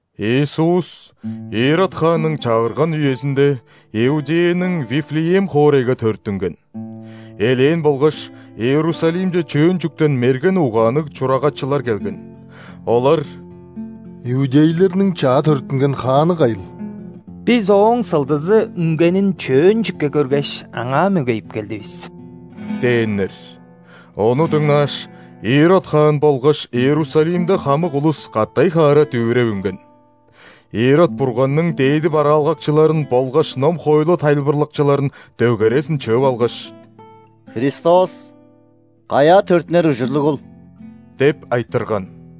Иисус Ирод хаанның чагырган үезиндеИудеяның Вифлеем хоорайга төрүттүнген. Элээн болгаш, Иерусалимче чөөн чүктен мерген угаанныг чурагачылар келген. Олар: «Иудейлерниң чаа төрүттүнген Хааны кайыл?Бис Ооң сылдызы үнгенин чөөн чүкке көргеш, Аңаа мөгейип келдивис» – дээннер. Ону дыңнааш, Ирод хаан болгаш Иерусалимде хамык улус катай-хаара дүвүреп үнген. Ирод Бурганның дээди бараалгакчыларын болгаш ном-хоойлу тайылбырлакчыларын дөгерезин чыып алгаш: «Христос каяа төрүттүнер ужурлугул?» – деп айтырган.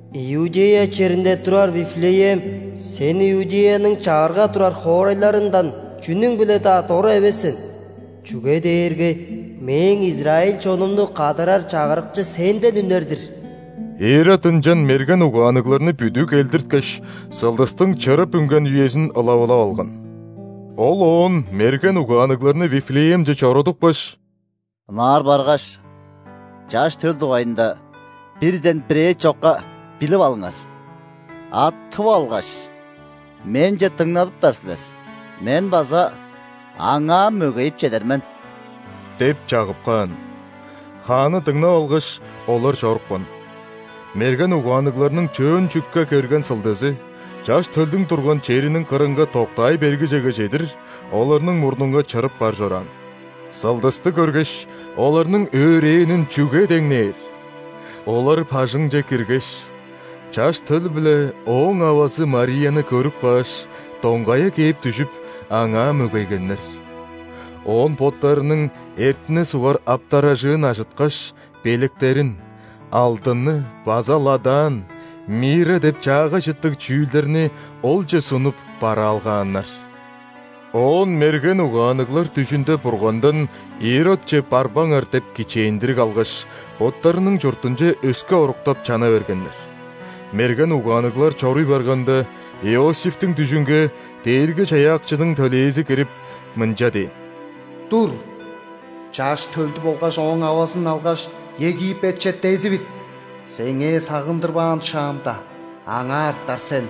„Иудея черинде турар Вифлеем,сен Иудеяның чагырга турар хоорайларындан чүнүң-биле-даа дора эвес сен,чүге дээрге Мээң израиль чонумну кадарар Чагырыкчы сенден үнер-дир“». Ирод ынчан мерген угаанныгларны бүдүү келдирткеш, сылдыстың чырып үнген үезин ылавылап алган. Ол оон мерген угаанныгларны Вифлеемче чорудупкаш: «Ынаар баргаш, Чаш төл дугайында бирден бирээ чокка билип алыңар. А тып алгаш, менче дыңнадыптар силер, мен база Аңаа мөгейип чедер мен» – деп чагып каан. Хаанны дыңнап алгаш, олар чорупкан. Мерген угаанныгларның чөөн чүкке көрген сылдызы, Чаш төлдүң турган чериниң кырынга доктаай бергижеге чедир, оларның мурнунга чырып бар чораан. Сылдысты көргеш, оларның өөрээнин чүге деңнээр! Олар бажыңче киргеш, Чаш төл биле Ооң авазы Марияны көрүп кааш, доңгая кээп дүжүп, Аңаа мөгейгеннер. Оон боттарының эртине сугар аптаражыын ажыткаш, белектерин: алдынны база ладан, мирра деп чаагай чыттыг чүүлдерниОлче сунуп бараалгааннар. Оон мерген угаанныглар дүжүнде Бургандан «Иродче барбаңар» деп кичээндириг алгаш, боттарының чуртунче өске оруктап чана бергеннер. Мерген угаанныглар чоруй барганда, Иосифтиң дүжүнге Дээрги-Чаяакчының төлээзи кирип, мынча дээн: «Тур, Чаш төлдү болгаш Ооң авазын алгаш, Египетче дезивит. Сеңээ сагындырбаан шаамда, аңаа артар сен,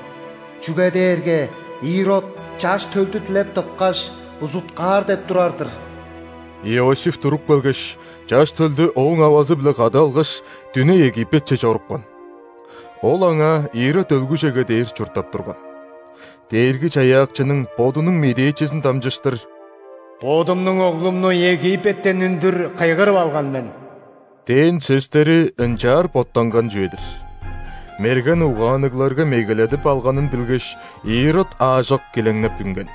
чүге дээрге Ирод Чаш төлдү дилеп тыпкаш, узуткаар деп турар-дыр». Иосиф туруп келгеш, Чаш төлдү Ооң авазы-биле кады алгаш, дүне Египетче чорупкан. Ол аңаа Ирод өлгүжеге дээр чурттап турган. Дээрги-Чаяакчының Бодунуң медээчизин дамчыштыр: «Бодумнуң Оглумну Египеттен үндүр кыйгырып алган мен»– дээн сөстери ынчаар боттанган чүве-дир. Мерген угаанныгларга мегеледип алганын билгеш, Ирод аажок килеңнеп үнген.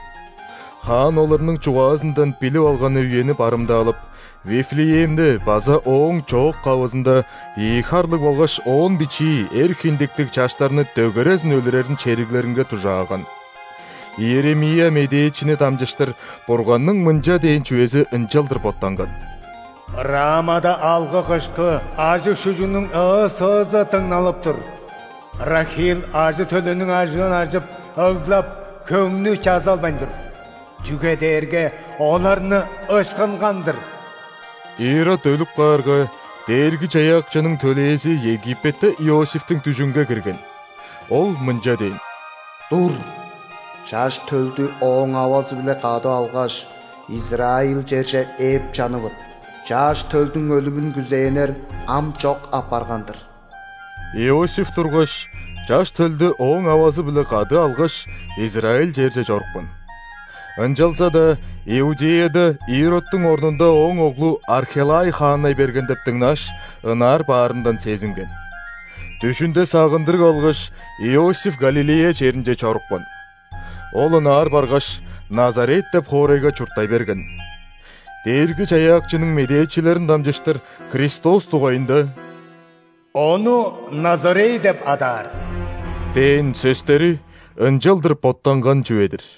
Хаан оларның чугаазындан билип алганы үени барымдаалап, Вифлеемде база ооң чоок-кавызында ийи харлыг болгаш оон бичии эр хиндиктиг чаштарны дөгерезин өлүрерин шериглеринге дужааган. Иеремия медээчини дамчыштыр Бурганның мынча дээн чүвези ынчалдыр боттанган: «Рамада алгы-кышкы, ажыг-шүжүгнүң ыы-сыызы дыңналып тур.Рахил ажы-төлүнүң ажыын ажып ыглап, хөңнү чазалбайн тур,чүге дээрге оларны ышкынган-дыр!» Ирод өлүп каарга, Дээрги-Чаяакчының төлээзи Египетте Иосифтиң дүжүнге кирген. Ол мынча дээн: «Тур, Чаш төлдү Ооң авазы-биле кады алгаш, израиль черже ээп чанывыт. Чаш төлдүң өлүмүн күзээннер ам чок апарган-дыр». Иосиф тургаш, Чаш төлдү Ооң авазы-биле кады алгаш, израиль черже чорупкан. Ынчалза-даа Иудеяда Иродтуң орнунда ооң оглу Архелай хааннай берген деп дыңнааш, ынаар баарындан сезинген. Дүжүнде сагындырыг алгаш, Иосиф Галилея черинче чорупкан. Ол ынаар баргаш, Назарет деп хоорайга чурттай берген. Дээрги-Чаяакчының медээчилерин дамчыштыр Христос дугайында: «Ону назорей деп адаар» – дээн сөстери ынчалдыр боттанган чүве-дир.